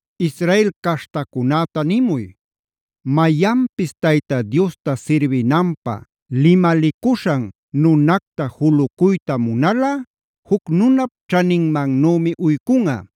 “Israel caśhtacunäta nimuy: ‘Mayanpis Tayta Diosta sirbinanpä limalicuśhan nunacta julucuyta munalꞌa juc nunap ćhaninmannümi uycunꞌa.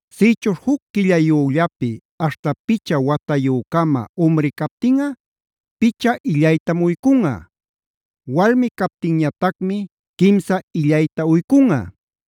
Sïchuśh juc quillayüllapi aśhta picha watayü-cama umri captinꞌa picha illaytam uycunꞌa; walmi captinñatacmi quimsa illayta uycunꞌa.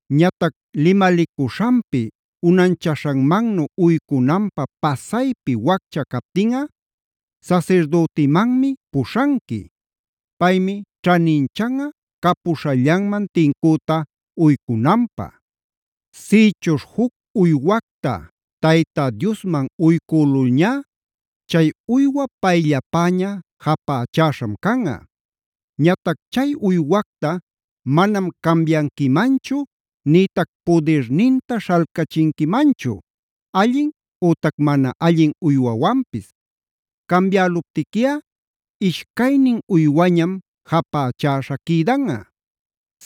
Ñatac limalicuśhanpi unanchaśhanmannu uycunanpä pasaypi waccha captinꞌa sasirdütimanmi puśhanqui. Paymi ćhaninchanꞌa capuśhallanman tincüta uycunanpä. “ ‘Sïchuśh juc uywacta Tayta Diosman uycülulñá, chay uywa payllapäña japächäśham canꞌa. Ñatac chay uywacta manam cambianquimanchu nïtac pudirninta śhalcachinquimanchu allin ütac mana allin uywawanpis. Cambialuptiquiꞌa ishcaynin uywañam japächäśha quïdanꞌa.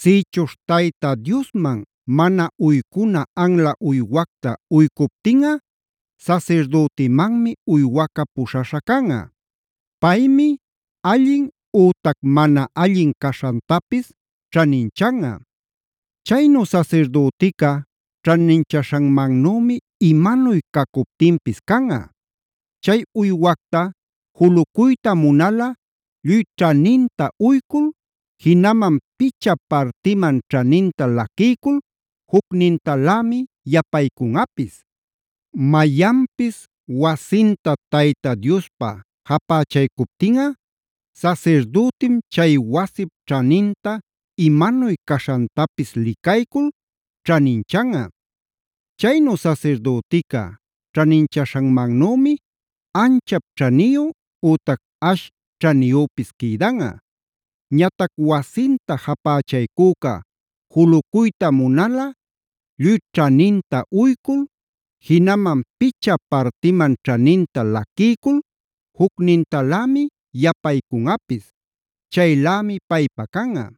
“ ‘Sïchuśh Tayta Diosman mana uycuna anla uywacta uycuptinꞌa sasirdütimanmi uywaca puśhaśha canꞌa. Paymi allin ütac mana allin caśhantapis ćhaninchanꞌa. Chaynu sasirdütica ćhaninchaśhanmannümi imanuy cacuptinpis canꞌa. Chay uywacta julucuyta munalꞌa lluy ćhaninta uycul, jinaman picha partiman ćhaninta laquiycul jucnintalämi yapaycunꞌapis. “ ‘Mayanpis wasinta Tayta Diospä japächaycuptinꞌa sasirdütim chay wasip ćhaninta imanuy caśhantapis licaycul ćhaninchanꞌa. Chaynu sasirdütica ćhaninchaśhanmannümi anchap ćhaniyu ütac ash ćhaniyüpis quïdanꞌa. Ñatac wasinta japächaycüca julucuyta munalꞌa lluy ćhaninta uycul, jinaman picha partiman ćhaninta laquiycul jucnintalämi yapaycunꞌapis. Chaylämi paypä canꞌa.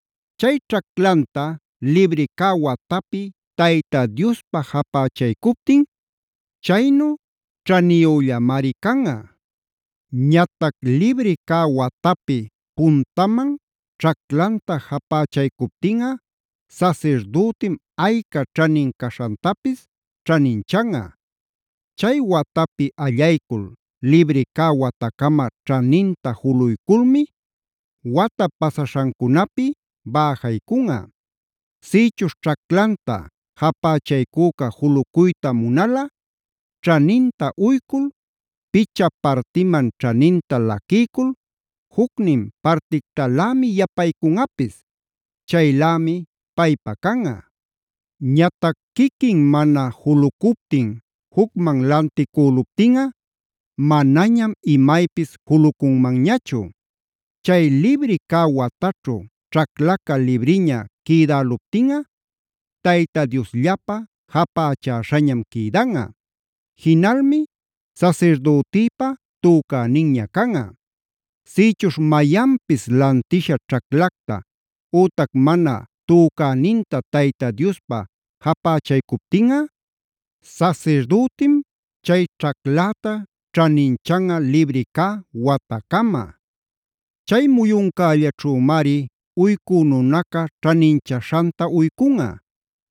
Chay ćhaclanta libri cä watapi Tayta Diospä japächaycuptin, chaynu ćhaniyüllamari canꞌa. Ñatac libri cä watapi puntaman ćhaclanta japächaycuptinꞌa sasirdütim ayca ćhanin caśhantapis ćhaninchanꞌa. Chay watapi allaycul libri cä watacama ćhaninta juluyculmi wata pasaśhancunapi bäjaycunꞌa. “ ‘Sïchuśh ćhaclanta japächaycüca julucuyta munalꞌa ćhaninta uycul, picha partiman ćhaninta laquiycul jucnin partictalämi yapaycunꞌapis. Chaylämi paypa canꞌa. Ñatac quiquin mana julucuptin jucman lanticüluptinꞌa manañam imaypis julucunmanñachu. Chay libri cä wataćhu ćhaclaca libriña quïdäluptinꞌa Tayta Diosllapä japächäśhañam quïdanꞌa. Jinalmi sasirdütïpa tucäninña canꞌa. “ ‘Sïchuśh mayanpis lantisha ćhaclacta ütac mana tücäninta Tayta Diospä japächaycuptinꞌa, sasirdütim chay ćhacläta ćhaninchanꞌa libri cä watacama. Chay muyuncällaćhümari uycu nunaca ćhaninchaśhanta uycunꞌa.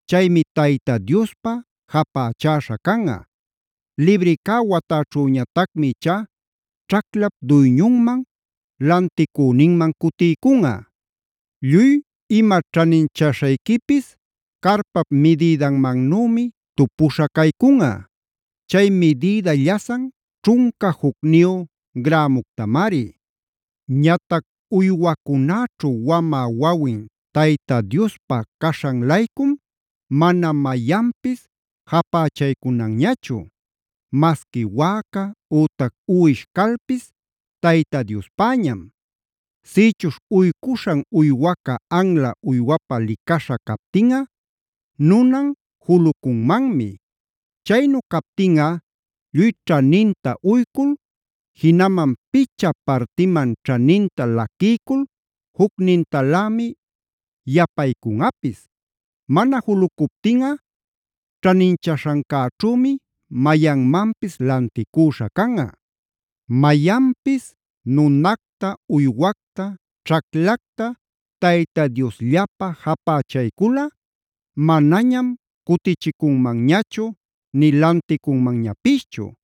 Chaymi Tayta Diospä japächäśha canꞌa. Libri cä wataćhüñatacmi ichá ćhaclap duyñunman, lanticüninman cutiycunꞌa. “ ‘Lluy ima ćhaninchaśhayquipis carpap midïdanmannümi tupuśha caycunꞌa; chay midïda llasan ćhunca jucniyu grämuctamari. “ ‘Ñatac uywacunäćhu wamä wawin Tayta Diospä caśhan-laycum mana mayanpis japächaycunanñachu. Masqui wäca, ütac uwish calpis Tayta Diospäñam. Sïchuśh uycuśhan uywaca anla uywapä licaśha captinꞌa nunan julucunmanmi. Chaynu captinꞌa lluy ćhaninta uycul, jinaman picha partiman ćhaninta laquiycul jucnintalämi yapaycunꞌapis. Mana julucuptinꞌa ćhaninchaśhancäćhümi mayanmanpis lanticüśha canꞌa. “ ‘Mayanpis nunacta, uywacta, ćhaclacta Tayta Diosllapä japächayculꞌa manañam cutichicunmanñachu nï lanticunmanñapischu.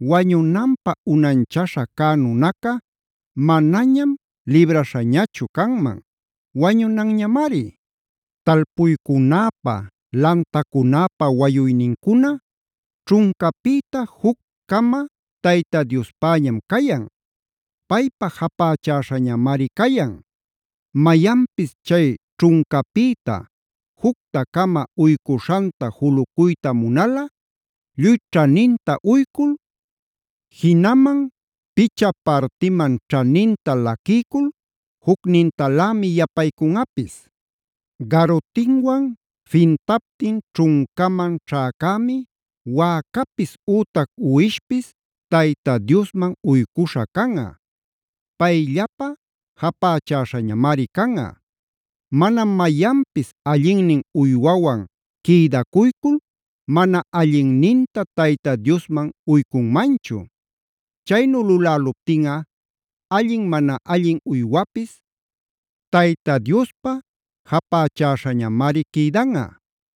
Wañunanpä unanchaśha cä nunaca manañam libraśhañachu canman; wañunanñamari. “ ‘Talpuycunäpa, lantacunäpa wayuynincuna ćhuncapïta juc-cama Tayta Diospäñam cayan; paypa japächäśhañamari cayan. Mayanpis chay ćhuncapïta jucta-cama uycuśhanta julucuyta munalꞌa lluy ćhaninta uycul, jinaman picha partiman ćhaninta laquiycul jucnintalämi yapaycunꞌapis. “ ‘Garutinwan fintaptin ćhuncaman ćhäcämi wäcapis ütac uwishpis Tayta Diosman uycuśha canꞌa; payllapä japächäśhañamari canꞌa. Manam mayanpis allinnin uywawan quïdacuycul mana allinninta Tayta Diosman uycunmanchu. Chaynu luläluptinꞌa allin mana allin uywapis Tayta Diospa japächäśhañamari quïdanꞌa;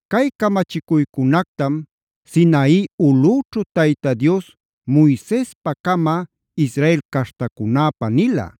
Cay camachicuycunactam Sinai ulꞌüćhu Tayta Dios Moisespacama Israel caśhtacunäpä nila.